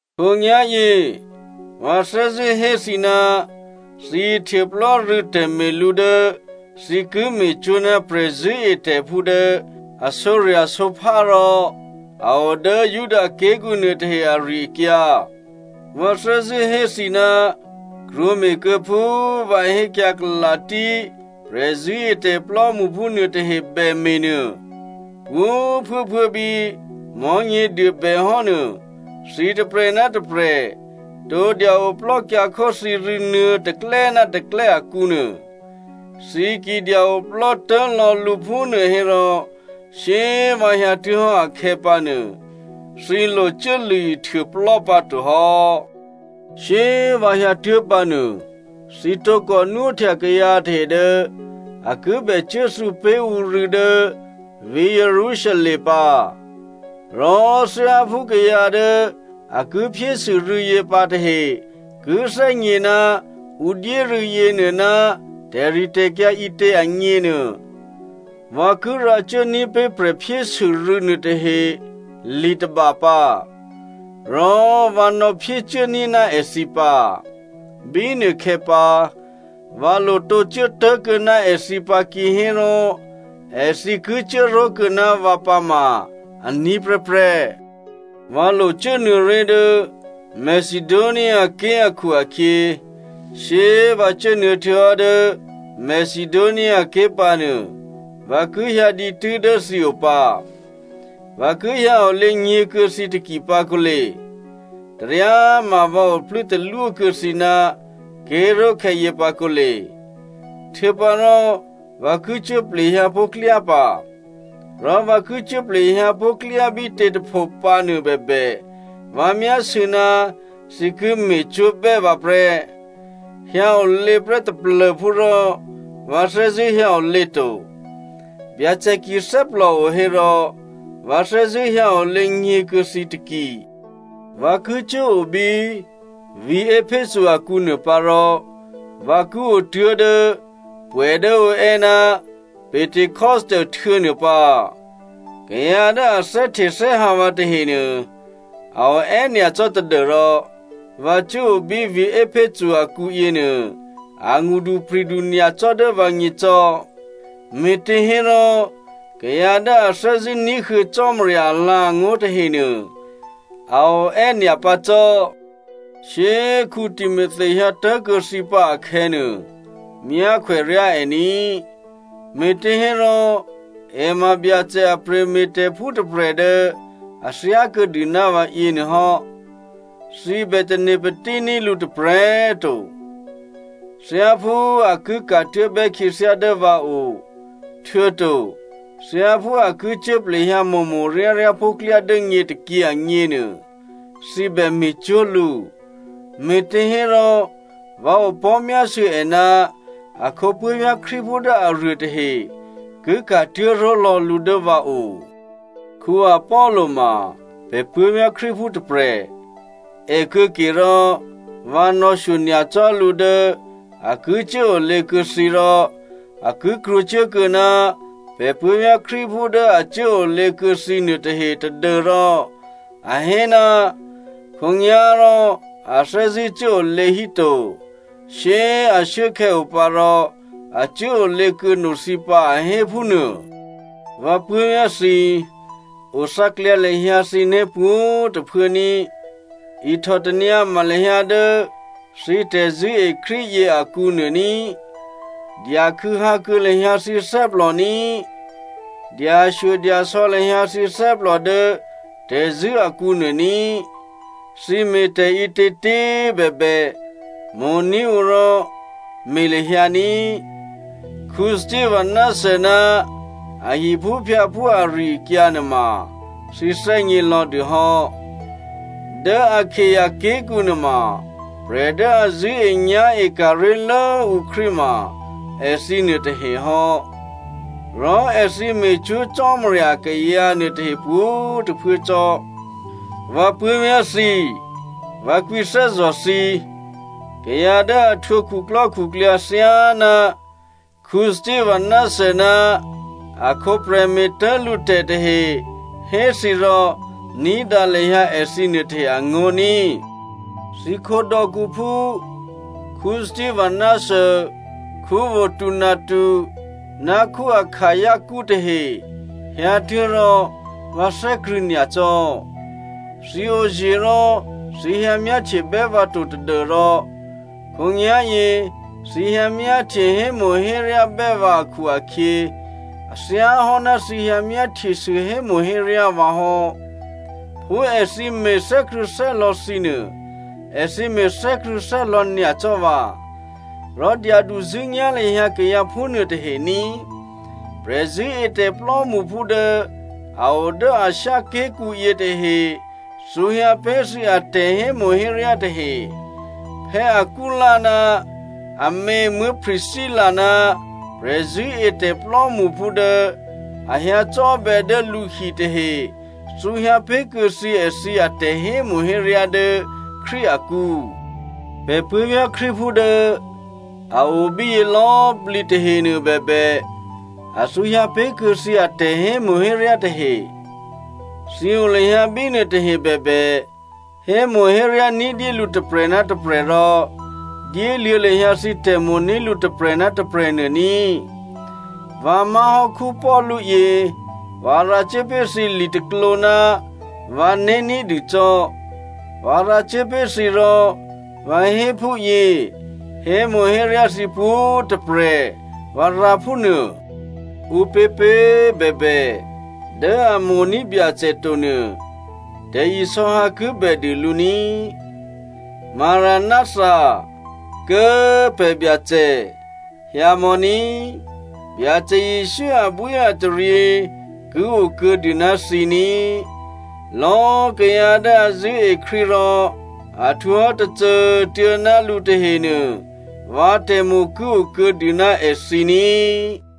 Khǒnyá̤yě, vǎ thè́zṳ̂́ hé thǐ ná thǐ ihtuôplò́ rû̌ tè̤me̤lǔ dố thǐ ki me̤cwó̤ ná prè̤zṳ̂́etè̤phú dố a sǒrya̤sǒphá rò a o dố Judaké̤kǔ nuôtahe ari-akyǎ. Vǎ thè́zṳ̂́ hé thǐ ná krwǒme̤kuô̌ phú vǎ hékyǎ Galasia prè̤zṳ̂́etè̤ plò́mṳphú nuôtahe bème̤ nuô. Pwǒ̤꤮ phuốphuố bí Mò̤́nyěduô bè hò́ nuô, thǐ tôprè̤ ná tôprè̤ tǒ dya oplò́kyǎkhó thǐ rû̌ nuô̌ tôklè́ ná tôklè́ akǔ nuô. Thǐ ki dya oplò́ tố̤ lò̌ lǔ phúnuô hérò shyé꤮ vǎ hyǎtuố̤hò́ akhè̌pǎnuô, thǐ locuố lṳ̂ ihtuôplò́ pǎto hò́. Shyé꤮ vǎ hyǎtuố̤ pǎ nuô, thǐ tǒkò nwóhtya kayǎ tahe dố a ki bè cuốthǔ pé̤ ǔ rû̌ dố vǐ̤ Jerusalem pǎ. Rò thyáphú kayǎ dố a ki phyésû rû̌yě pǎ tahe ki thè́gně ná ǔ dyé rû̌ yěnuô ná tè̤ritè̤kyǎ ǐtě agněnuô, vǎ ki rǎcuốní̤ pé̤ prè̤phyésû rû̌ nuôtahe li tôba pǎ, rò vǎ nò̌phyécuốní̤ ná èthǐ pǎ. Bínuôkhè̌ pǎ, vǎ lo tǒ cuố tố̤kuô̌ná èthǐ pǎ kihérò èthǐ ki cuốró̤kuô̌ ná vǎ pǎma aní̤ prè́prè́. Vǎ lo cuốnuô̌ré̤ dố Macedoniaké̤ akhu-akhyě, shyé꤮ vǎ cuốnuô̌ htuô̌hò́ dố Macedoniaké̤ pǎ nuô, vǎ ki hyǎ dǐtû́ dố thǐ o pǎ. Vǎ ki hyǎ olě nyě̤ kuô̌ thǐ taki pǎ kǒle. Taryá꤮ ma vǎ oplû́ talwó kuô̌ thǐ ná ké̤ró̤khè̌ yě pǎ kǒle. Htuô̌pǎrò, vǎ ki cuố plehyǎ pó̤ klyá pǎ. Rò vǎ ki cuố plehyǎ pó̤ klyá bítě꤮ tôpho pǎnuô bèbè, vǎ myásû̌ ná thǐ ki me̤cwó̤bè́ vǎ prè́. Hyǎ olě prè́ taplô̤phú rò vǎ thè́zṳ̂́ hyǎ olě to. Byacè ki thè́plòo hérò, vǎ thè́zṳ̂́ hyǎ olě nyě̤ kuô̌ thǐ taki. Vǎ ki cuố o bí vǐ̤ Epheso akǔ nuô pǎ rò vǎ ki o tuố̤dố pwè̌ dố ǔ è́ ná Pentecosto htuô̌ nuô pǎ. Kayǎ dố a thè́htethè́hǎ vǎ tahenuô a o è́nyacò́ tadû́rò vǎ cuố o bí vǐ̤ Epheso akǔ yěnuô a ngṳdupri̤du nyacò́ dố vǎgně cò́, me̤těhérò kayǎ dố a thè́zṳ̂́ ní̤huô̌ Cò́marya alǎ̤angó̤ tahenuô a o è́ nyapǎcò́. Shyé꤮ Timothy hyǎ tố̤kuô̌ thǐ pǎ akhè̌nuô, myákhwè ryá è ní꤮, me̤těhérò è ma Byacè a prè̤me̤tè̤phú tôprè̤ dố a thyákuô̌dû ná vǎ yěnuô hò́. Thǐ bè tane̤ patíní̤ lǔ tôprè̤꤮ to. Thyáphú a ki ka̤tuố̤bè́ khyě dố vǎ o, htuô̌to thyáphú a ki cuố plehyǎ mo̤mo̤ ryáryá pó̤ klyá dố nyě tôkyě agněnuô, thǐ bè me̤cwó̤ lǔ, me̤těhérò vǎ opò̤́myásû̌ è ná akhǒ puố̤vyá̤ Krístuphú dố aruô tahe ki ka̤tuố̤ ró̤lò̌ lǔ dố vǎ o. Apollo ma pè̤ puố̤vyá̤ Krístuphú tôprè̤. È kuô̌ke rò vǎ nò̌shyo nyacò́ lǔ dố a ki cuốolě kuô̌ thǐ rò a ki krwǒcuốkuô̌ ná pè̤ puố̤vyá̤ Krístuphú dố a cuốolě kuô̌ thǐ nuôtahe tadû́rò a hé ná khǒnyá̤rò a thè́zṳ̂́ cuốolě hí to, shyé꤮ ashuốkhè̌ o pǎ rò a cuốolě kuô̌ no thǐ pǎ a hé phúnuô. Vǎ puố̤vyá̤ thǐ꤮, othǎklyǎ lahyǎ thǐné̤ pwǒ̤꤮ tôphuố ní꤮, ihtò tanyǎma lahyǎ dố thǐ tè̤zṳ̂́e Krístu yě akǔnuô ní꤮, dya khû̌hǎ kuô̌ lahyǎ thǐ thè́plò ní꤮, dyashyodyasò̌ lahyǎ thǐ thè́plò dố tè̤zṳ̂́ akǔnuô ní꤮. Thǐ me̤ tè̤ǐtětě꤮ bèbè, mo̤ní̤ ǔ rò me̤ lahyǎ ní꤮. Stephana ná a hiphúphyǎphú ari-akyǎ nuôma thǐ thè́gně lò̌dû hò́. Dố Akaia ké̤kǔ nuôma, prè̤ dố a zṳ̂́enyá̤e ka̤ ré̤lố ǔ Krístu ma èthǐ nuôtahe hò́. Rò èthǐ me̤cwó̤ Cò́marya akayǎ nuôtahe pwǒ̤꤮ tôphuố cò́. Vǎ puố̤vyá̤ thǐ꤮, vǎ kwǐthè́zò̤ thǐ꤮, kayǎ dố a htwǒ khuklò́khuklyǎ thyáná Stephana ná akhǒ prè̤me̤tố̤ lǔ tè̤ tahe hé thǐ rò ní̤dǎ lahyǎ èthǐ nuôtahe angó̤ ní꤮. Thǐkhǒ dò̌kǔphú Stephana, Fortunato ná Akaicu tahe hyǎtuố̤ rò vǎ thè́krṳ̂̌ nyacò́. Thǐ oye̤ rò thǐ hyǎ myáhtyebè́ vǎ to tadû́rò khǒnyá̤yě èthǐ hyǎ myáhtye hémo̤héryábè́ vǎ akhu-akhyě, a thyáhò́ ná thǐ hyǎ myáhtyesû hémo̤héryá vǎ hò́. Phú èthǐ me̤ thè́krṳ̂̌thè́lò̌ thǐ nuô, èthǐ me̤ thè́krṳ̂̌thè́lò̌ nyacò́ vǎ. Rò dyaduzṳ̂́nyá̤ lahyǎ kayǎ phúnuô tahe ní꤮. Prè̤zṳ̂́etè̤ plò́mṳphú dố a o dố Asia ké̤kǔ yětahe thǔhyǎ pé̤ thǐ atè̤hémo̤héryá tahe. Aquila ná amě Priscilla ná prè̤zṳ̂́etè̤ plò́mṳphú dố a hyǎcò́bè̌ dố lǔhi tahe thǔhyǎ pé̤kuô̌ thǐ èthǐ atè̤ hémo̤héryá dố Krístu akǔ. Pè̤ puố̤vyá̤ Krístuphú dố a o bíyě lò̌꤮ plǐ tahenuô bèbè, a thǔhyǎ pé̤kuô̌ thǐ atè̤ hémo̤héryá tahe. Thǐ o lahyǎ bínuô tahe bèbè, hémo̤héryá ní̤dyé lǔ tôprè̤ ná tôprè̤ rò dyéluô̌ lahyǎ thǐ tè̤mo̤ní̤ lǔ tôprè̤ ná tôprè̤ nuô ní꤮. Vǎ má̤hò́ Paulu yě, vǎ rǎcuố pé̤ thǐ litôklǒ ná vǎné̤ ní̤dû cò́. Vǎ rǎcuố pé̤ thǐ rò vǎ hé phúyě, “Hémo̤héryá thǐ pwǒ̤꤮ tôprè̤,” vǎ rǎ phúnuô. Ǔpěpě꤮ bèbè, dố a mo̤ní̤ Byacè to nuô, tè̤isò̌hǎ ki bèdû lǔ ní꤮. “Maranátha” Kố꤮ pè̤ Byacè꤮! Hyǎmò̌ ní꤮. Byacè Jesǔ abwíataryě ki o kuô̌dû ná thǐ ní꤮. Lò̌꤮ kayǎ dố a zṳ̂́e Krístu rò a htwǒhò́ tôcô꤮ tuô̌ ná lǔ tahenuô, vǎ tè̤mo̤ ki okuô̌dû ná èthǐ ní꤮.